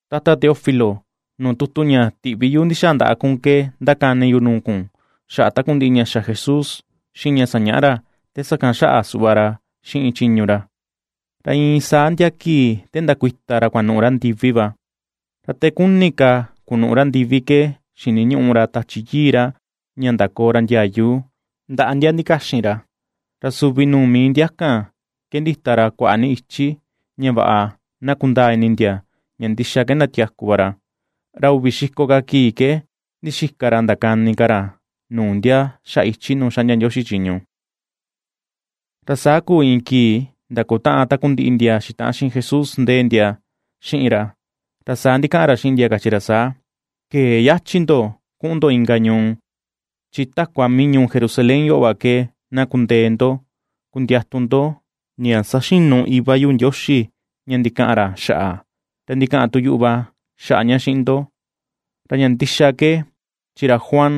Tata Teófilo, nuu tutu ña tiꞌvi yu ndi̱xa̱a̱ ndaꞌa kun ke ^ndakani yu nuu kun xaꞌa takundiꞌi ña xa Jesús xiꞌin ña sañaꞌa ra te sakan xaꞌa suꞌva ra xiꞌin chiñu ra, ra iin saa ndia kii te ndakuita ra kuanuꞌu ra ndiví va. Ra te kuni ka kunuꞌu ra ndivi ke xiniñuꞌu ra Tachi Yii ra ña ndakoo ra ndiayu ndaꞌa ndia ndikaxin ra. Ra suvi nuu mii ndia kan ke ndita ra kuaꞌa ni ichi, ña vaꞌa na kundaa ini ndia ña ndixa ke ndatiaku va ra. Ra uvi xiko ka kii ke ndixika ra ndakani ka ra nuu ndia xaꞌa ichi nuu ^xaꞌndia Ndioxi chiñu. Ra saa kuu iin kii ndakutaꞌan takundiꞌi ndia xitaꞌan xiꞌin Jesús ndee ndia xiꞌin ra, ra saa ndikaꞌan ra xiꞌin ndia kachi ra saa: ―Këe yachi ndo kuꞌun ndo inka ñuu; chi takua mii ñuu Jerusalén yoꞌo va ke, na kundee ndo kundiatu ndo ña saxinu Iva yu Ndioxi ña ndikaꞌan ra xaꞌa, ra ndikaꞌan tu yuꞌu va xaꞌa ña xiꞌin ndo. Ra ña ndixa ke chi ra Juan,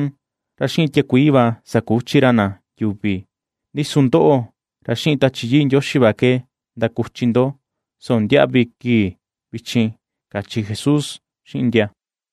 ra xiꞌin tiakuii va sakuchi ra na yuvi, ndi su ndoꞌo, ra xiꞌin Tachi Yii Ndioxi va ke ndakuchi ndo soo ndiaꞌvi kii vichin ―kachi Jesús xiꞌin ndia.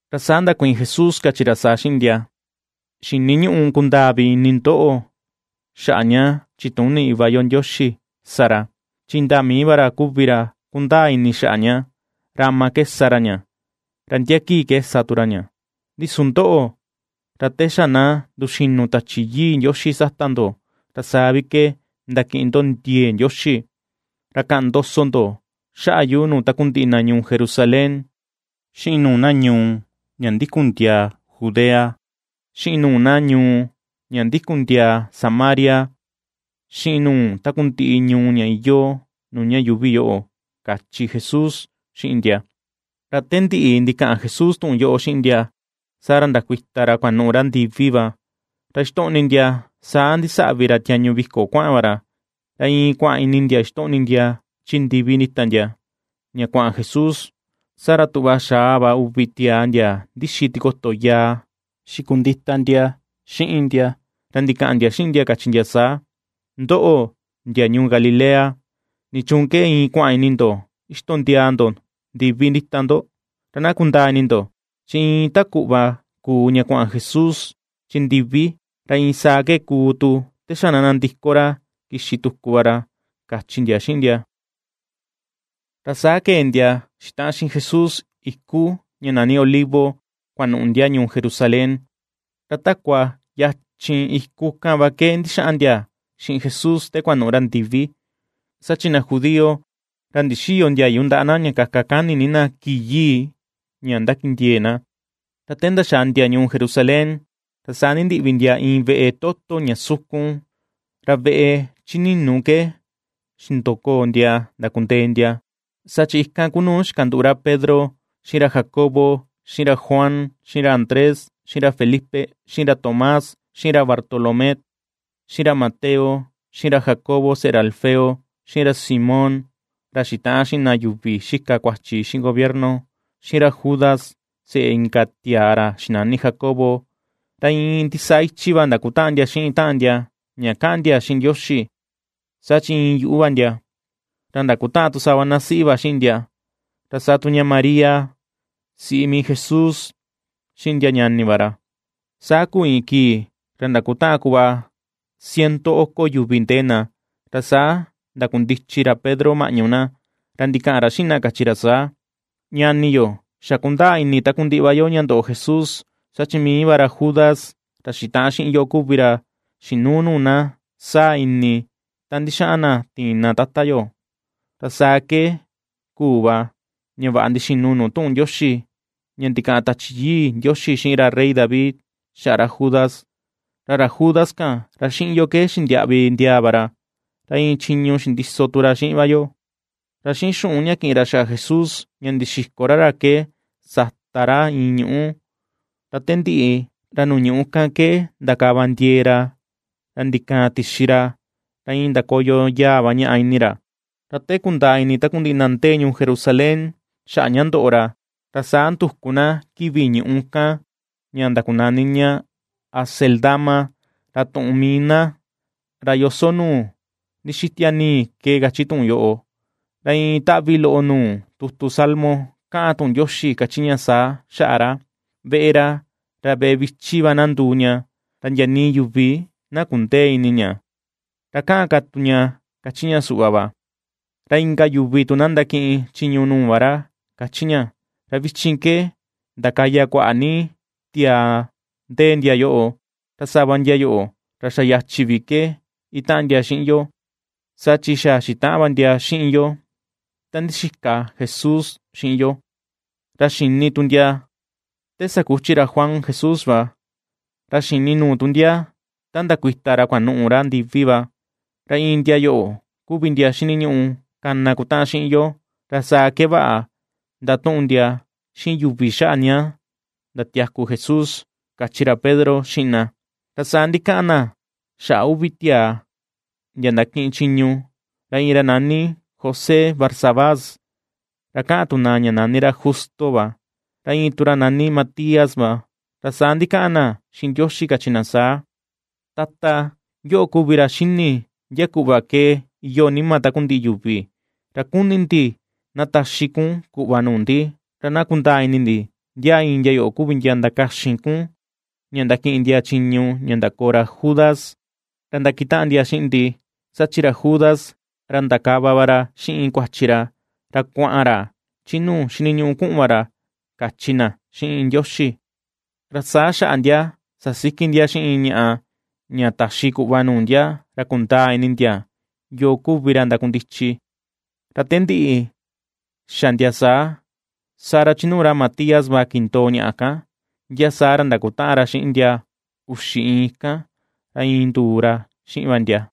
Ra saa ndakuiin Jesús kachi ra saa xiꞌin ndia: ―Xiniñüꞌu kundaa vi ini ndoꞌo xaꞌa ña chituni Iva yo Ndioxi sa ra, chi indaa mii va ra kuvi ra kundaa ini xaꞌa ña, ra ama ke sa ra ña, ra ndia kii ke sa tu ra ña. Ndi su ndoꞌo, ra te xa ná nduxínu̱ Tachi Yii Ndioxi sata ndo, ra saa vi ke ndakiꞌin ndo ndiee Ndioxi; ra kaꞌan ndoso ndo xaꞌa yu nuu takundiꞌi na ñuu Jerusalén, xiꞌin nuu na ñuu ña ndikun ndiaa Judea, xiꞌin nuu na ñuu ña ndikun ndiaa Samaria, xiꞌin nuu takundiꞌi ñuu ña iyoo nuu ña yuuvi yoꞌo ―kachi Jesús xiꞌin ndia. Ra te ndiꞌi ndikaꞌan Jesús tuꞌun yoꞌo xiꞌin ndia, saa ra ndakuita ra kuanuꞌu ra ndivi va, ra ixtoꞌni ndia saa ndisaꞌvi ra tiañu viko kuaꞌan va ra. Ra iin kuaꞌan ini ndia ixtoꞌni ndia chi ndivi ndíta ndia, ña kuaꞌan Jesús, saa ra tuꞌva xaa va uvi tiaa ndia ndixi tikoto yaa xikundita ndia xiꞌin ndia. Ra ndikaꞌan ndia xiꞌin ndia kachi ndia saa: ―Ndoꞌo, ndia ñuu Galilea, ¿nichuun ke iin kua̱ꞌa̱n ini ndo ixtondiaa ndo ndivi ndíta ndo? Ra na kundaa ini ndo chi iin ta kuꞌva kuu ña kuaꞌan Jesús chi ndivi, ra iin saa ke kuu tu te xa na nandiko ra kixi tuku va ra ―kachi ndia xiꞌin ndia. Ra saa kee ndia xitaꞌan xiꞌin Jesús iku ña nani Olivo, kuanuꞌu ndia ñuu Jerusalén. Ra takua yachin iku kan va ke ndixaꞌan ndia xiꞌin Jesús te kuanuꞌu ra ndivi, saa chi na judío ra ndixïyo ndiayu ndaꞌa na ña kaka kani ni na kii yii ña ndakindiee na. Ra te ndaxàà ndia ñuu Jerusalén, ra saa ndindiꞌvi ndia iin veꞌe toto ña sukun, ra veꞌe chi ninu ke xindokoo ndia ndakundee ndia. Saa chi ikan ku nu xikanduꞌu ra Pedro, xiꞌin ra Jacobo, xiꞌin ra Juan, xiꞌin ra Andrés, xiꞌin ra Felipe, xiꞌin ra Tomás, xiꞌin ra Bartolomé, xiꞌin ra Mateo, xiꞌin ra Jacobo seꞌe ra Alfeo, xiꞌin ra Simón ra xitaꞌan xiꞌin na yuvi xika kuachi xiꞌin gobierno, xiꞌin ra Judas seꞌe inka tiaa ra xinani Jacobo. Ra iin ndisaa ichi va ^ndakutaꞌan ndia xiꞌin taꞌan ndia ña kaꞌan ndia xiꞌin Ndioxi, saa chi iin yuꞌu va ndia; ra ndakutaꞌan tu sava na siꞌi va xiꞌin ndia, ra saa tu ña María, siꞌi mii Jesús, xiꞌin ndia ñani va ra. Saa kuu iin kii ra ndakutaꞌan kuꞌva ciento oko yuvi ndee na, ra saa ndakundichi ra Pedro maꞌñu na, ra ndikaꞌan ra xiꞌin na kachi ra saa: ―Ñani yo, xa kundaa ini takundiꞌi va yo ña ndoꞌo Jesús saa chi mii va ra Judas, ra xitaꞌan xiꞌin yo kuvi ra xinuu nuu na saa ini ta ndixaꞌan na tiin na Tata yo. Ra saa ke kuu va ña vaꞌa ndixinu nuu tuꞌun Ndioxi ña ndikaꞌan Tachi Yii Ndioxi xiꞌin ra rey David xaꞌa ra Judas. Ra ra Judas kan, ra xiꞌin yoo ke xindiaꞌvi ndiaa va ra, ra iin chiñu xindiso tu ra xiꞌin va yo. (Ra xiꞌin xuꞌun ña ki̱ꞌin ra xaꞌa Jesús ña ndixiko ra ra ke sata ra iin ñuꞌú. Ra te ndiꞌi, ra nuu ñuꞌu kan ke ndakava ndiee ra, ra ndi̱ka̱a̱n tixi ra, ra iin ndakoyo yaa va ñaꞌa ini ra. Ra te kundaa ini takundiꞌi na ndéé ñuu Jerusalén xaꞌa ña ndoꞌo ra, ra saa nduku na kivi ñuꞌu kan, ña ndakunani ña Acéldama, ra tuꞌun mii na, ra “Yoso nuu ndixitia nii” ke kachi tuꞌun yoꞌo.) Ra iin taꞌvi loꞌo nuu tutu Salmo ^kaꞌan tuꞌun Ndioxi ^kachi ña saa xaꞌa ra: Veꞌe ra, ra veꞌe vichi va na nduu ña, ra ndia nii yuvi ná kundëe ini ña. Ra kaꞌan ka tu ña kachi ña suꞌva va: Ra inka yuvi tu na ndakiꞌin chiñu nuu va ra, ^kachi ña. ’Ra vichin ke ndakaya kuaꞌa ni tiaa ndee ndia yoꞌo, ra sava ndia yoꞌo ra xa yachi vi ke itaꞌan ndia xiꞌin yo, saa chi xa xitaꞌan va ndia xiꞌin yo ta ndixika Jesús xiꞌin yo, ra xini tu ndia te sakuchi ra Juan Jesús va, ra xini nuu tu ndia ta ndakuita ra kuanuꞌu ra ndivi va. Ra iin ndia yoꞌo kuvi ndia xiniñuꞌu kana kutaꞌan xiꞌin yo, ra saa ke vaꞌa ndatuꞌun ndia xiꞌin yuvi xaꞌa ña ndatiaku Jesús. ―kachi ra Pedro xiꞌin na. Ra saa ndikaꞌan na xaꞌa uvi tiaa, ndia ndakiꞌin chiñu. Ra iin ra nani José Barsabás, ra kaꞌan tu na ña nani ra Justo va; ra iin tu ra nani Matías va. Ra saa ndikaꞌan na xiꞌin Ndioxi kachi na saa: ―Tata, yoꞌo kuvi ra xíni̱ ndia kuꞌva ke iyoo nima takundiꞌi yuvi; ra kuni̱ ndi na taxi kun kuꞌva nuu ndi, ra na kundaa ini ndi ndia iin ndia yoꞌo kuvi ndia ndakaxin kun, ña ndakiꞌin ndia chiñu ña ndakoo ra Judas, ra ndakitaꞌan ndia xiꞌin ndi, saa chi ra Judas, ra ndakava va ra xiꞌin kuachi ra, ra kua̱ꞌa̱n ra chi nuu xiniñuꞌu ku̱ꞌu̱n va ra ―kachi na xiꞌin Ndioxi. Ra saa xaꞌa ndia sasiki ndia xiꞌin iin ñaꞌa, ña taxi kuꞌva nuu ndia, ra kundaa ini ndia yoo kuvi ra ndakundichi. Ra te ndiꞌi xa ndia saa, saa ra chi nuu ra Matías va kindoo ñaꞌa kan; ndia saa ra ndakutaꞌan ra xiꞌin ndia uxi iin kan, ra iin nduu ra xiꞌin va ndia.